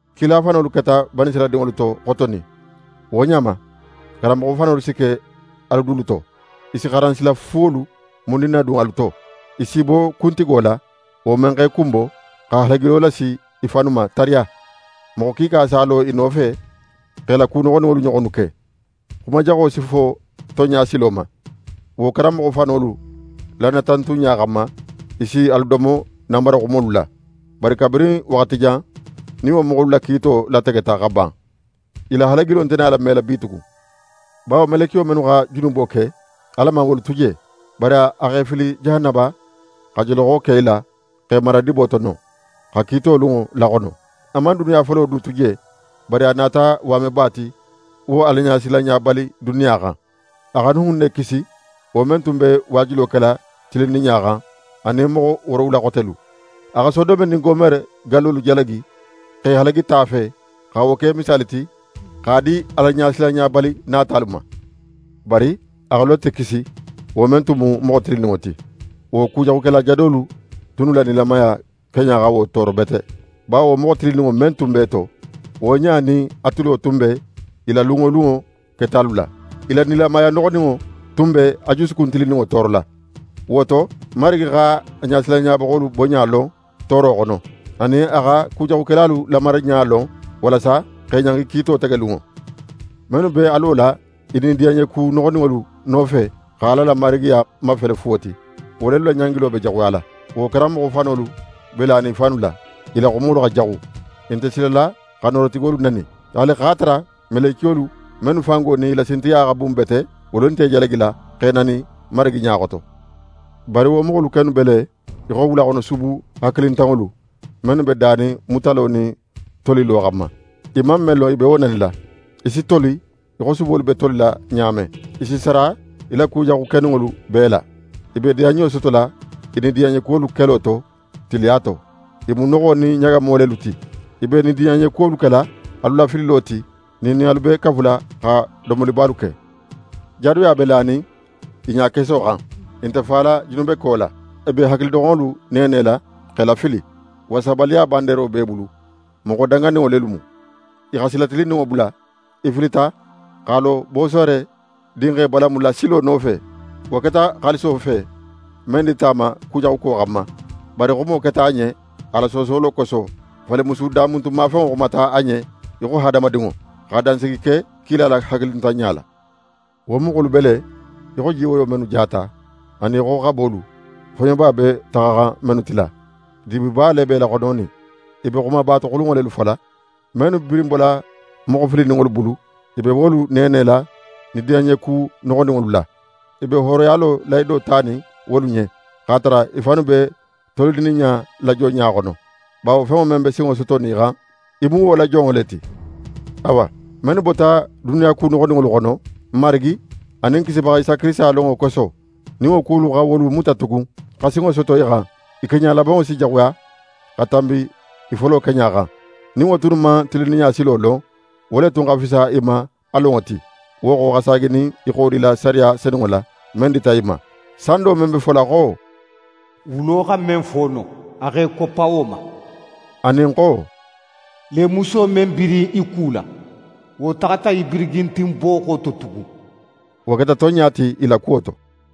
Kila fanolu keta Banisirayila dinŋolu to xotonin, wo ɲa ma, karanmoxo fanolu si ke alu dulu to. I si xaransila fuwolu mundin nadun alu to. I si i bo Kuntigo la, wo men x'e kunbo, xa halagilo lasi i fannu ma tariya. Moxo kiika si a lo i nofe x'e la ku noxoninŋolu ɲoxonnu ke. Xumajaxo si fo tonɲa silo ma. Wo karanmoxo fanolu la natantunɲa xanma, i si alu domo nanbara xumolu la. Bari kabirin waxati jan nin wo moxolu la kiito lategeta xa ban, i la halagilo nte nala mela bitugun. Bawo melekiyo mennu xa junubo ke, Ala man wolu tu je, bari a x'e fili jahanaba, xa joloxo ke i la x'e mara dibo to non, xa kiito lunŋo laxono. A man duniya folo du tu je, bari a nata waameba ti wo Alaɲasilanɲabali duniya xan. A xa Nuhun ne kisi, wo men tun be waajulo kela tilinninɲa xan, anin moxo woorowula xotelu. A xa Sodome nin Gomore gallolu jalagi x'e halagi ta fe, xa wo ke misaali ti x'a di Alaɲasilanɲabali natalu ma. Bari a xa Lote kisi, wo men tun mu moxo tilinninŋo ti. Wo kujaxukela jadolu tunnu la nilamaya keɲa xa wo tooro bete. Bawo wo moxo tilinninŋo men tun b'e to, wo ɲa nin a tulo tun be i la lun wo lunŋo ketalu la. I la nilamaya noxoninŋo tun be a jusukun tilinninŋo toorola. Wo to, Marigi x'a ɲasilanɲabaxolu boɲa lon tooro xono, anin a xa kujaxukelalu lamaraɲa lon walasa x'e ɲangi kiito tegelunŋo. Mennu be a lola i nidiyanɲeku noxoninŋolu nofe, xa Ala la Marigiya mafele fuwo ti, wo lelu la ɲangilo be jaxuyala. Wo karanmoxo fanolu be lanin i fannu la, i la xumolu xa jaxu, i nte silala xa Noorotigolu nani. Haali x'a tara melekiyolu mennu fango nin i la sintigiya xa bun bete, wolu nte i jalagila x'e nani Marigi ɲa xoto. Bari wo moxolu kennu be le í xo wulaxonosubu hakilintanŋolu, mennu be danin mutalo nin tolilo xanma. I man men lon, i be wo nanila. I si toli í xo subolu be tolila ɲa men. I si sara i la kujaxu keninŋolu bee la. I be i diyanɲo sotola i nidiyanɲekuwolu kelo to, tiliya to. I mu noxo nin ɲagamo lelu ti, i be i diyanɲekuwolu kela alu lafililo ti, nin i nin alu be kafula xa domolibalu ke. Jadoya be lanin i ɲakeso xan, i nte fala junubeko la. I be hakilidoxonŋolu neenela x'e lafili. Wasabaliya bandeero b'e bulu, moxo danganinŋo lelu mu. I xa sila tilinninŋo bula. I filita x'a lo Bosore dinxe Balamu la silo nofe. Wo keta xaaliso fe, men dita a ma kujaxuko xanma. Bari xumo keta a ɲen a la soosolo koso. Falimusu damuntunmafenŋo xumata a ɲen í xo hadamadinŋo, xa dansigi ke kila la hakilintanɲa la. Wo moxolu be le í xo jiwoyo mennu jata, anin í xo xabolu, foɲoba be taxaxan mennu tila. Dibiba le be i laxononin. I be xumabatoxulunŋo lelu fola. Mennu birin bola moxo filininŋolu bulu, i be wolu neenela nidiyanɲeku noxoninŋolu la. I be hooroyalo lahido tanin wolu ɲen, x'a tara i fannu be tolininɲa la jonɲa xono, bawo fenŋo men be sinŋo sotonin í xan, í mu wo la jonŋo le ti. Awa, mennu bota duniya ku noxoninŋolu xono, n Marigi anin n Kisibaxa Isa Kirisita lonŋo koso, nin wo kuwolu xa wolu muta tugun, xa sinŋo soto i xan, i keɲa labanŋo si jaxuya xa tanbi i folo keɲa xan. Nin wo tunnu man tilinninɲa silo lon, wo le tun xa fisa i ma a lonŋo ti, wo xo xa saaginin i xodila sariya senunŋo la, men dita i ma. Sando men be fola xo: «Wulo xa men foono, a x'é koppa wo ma,» anin xo: «Lemuso men birin í kula, wo taxata í birigintin booxo to tugun.» Wo keta tonɲa ti i la kuwo to.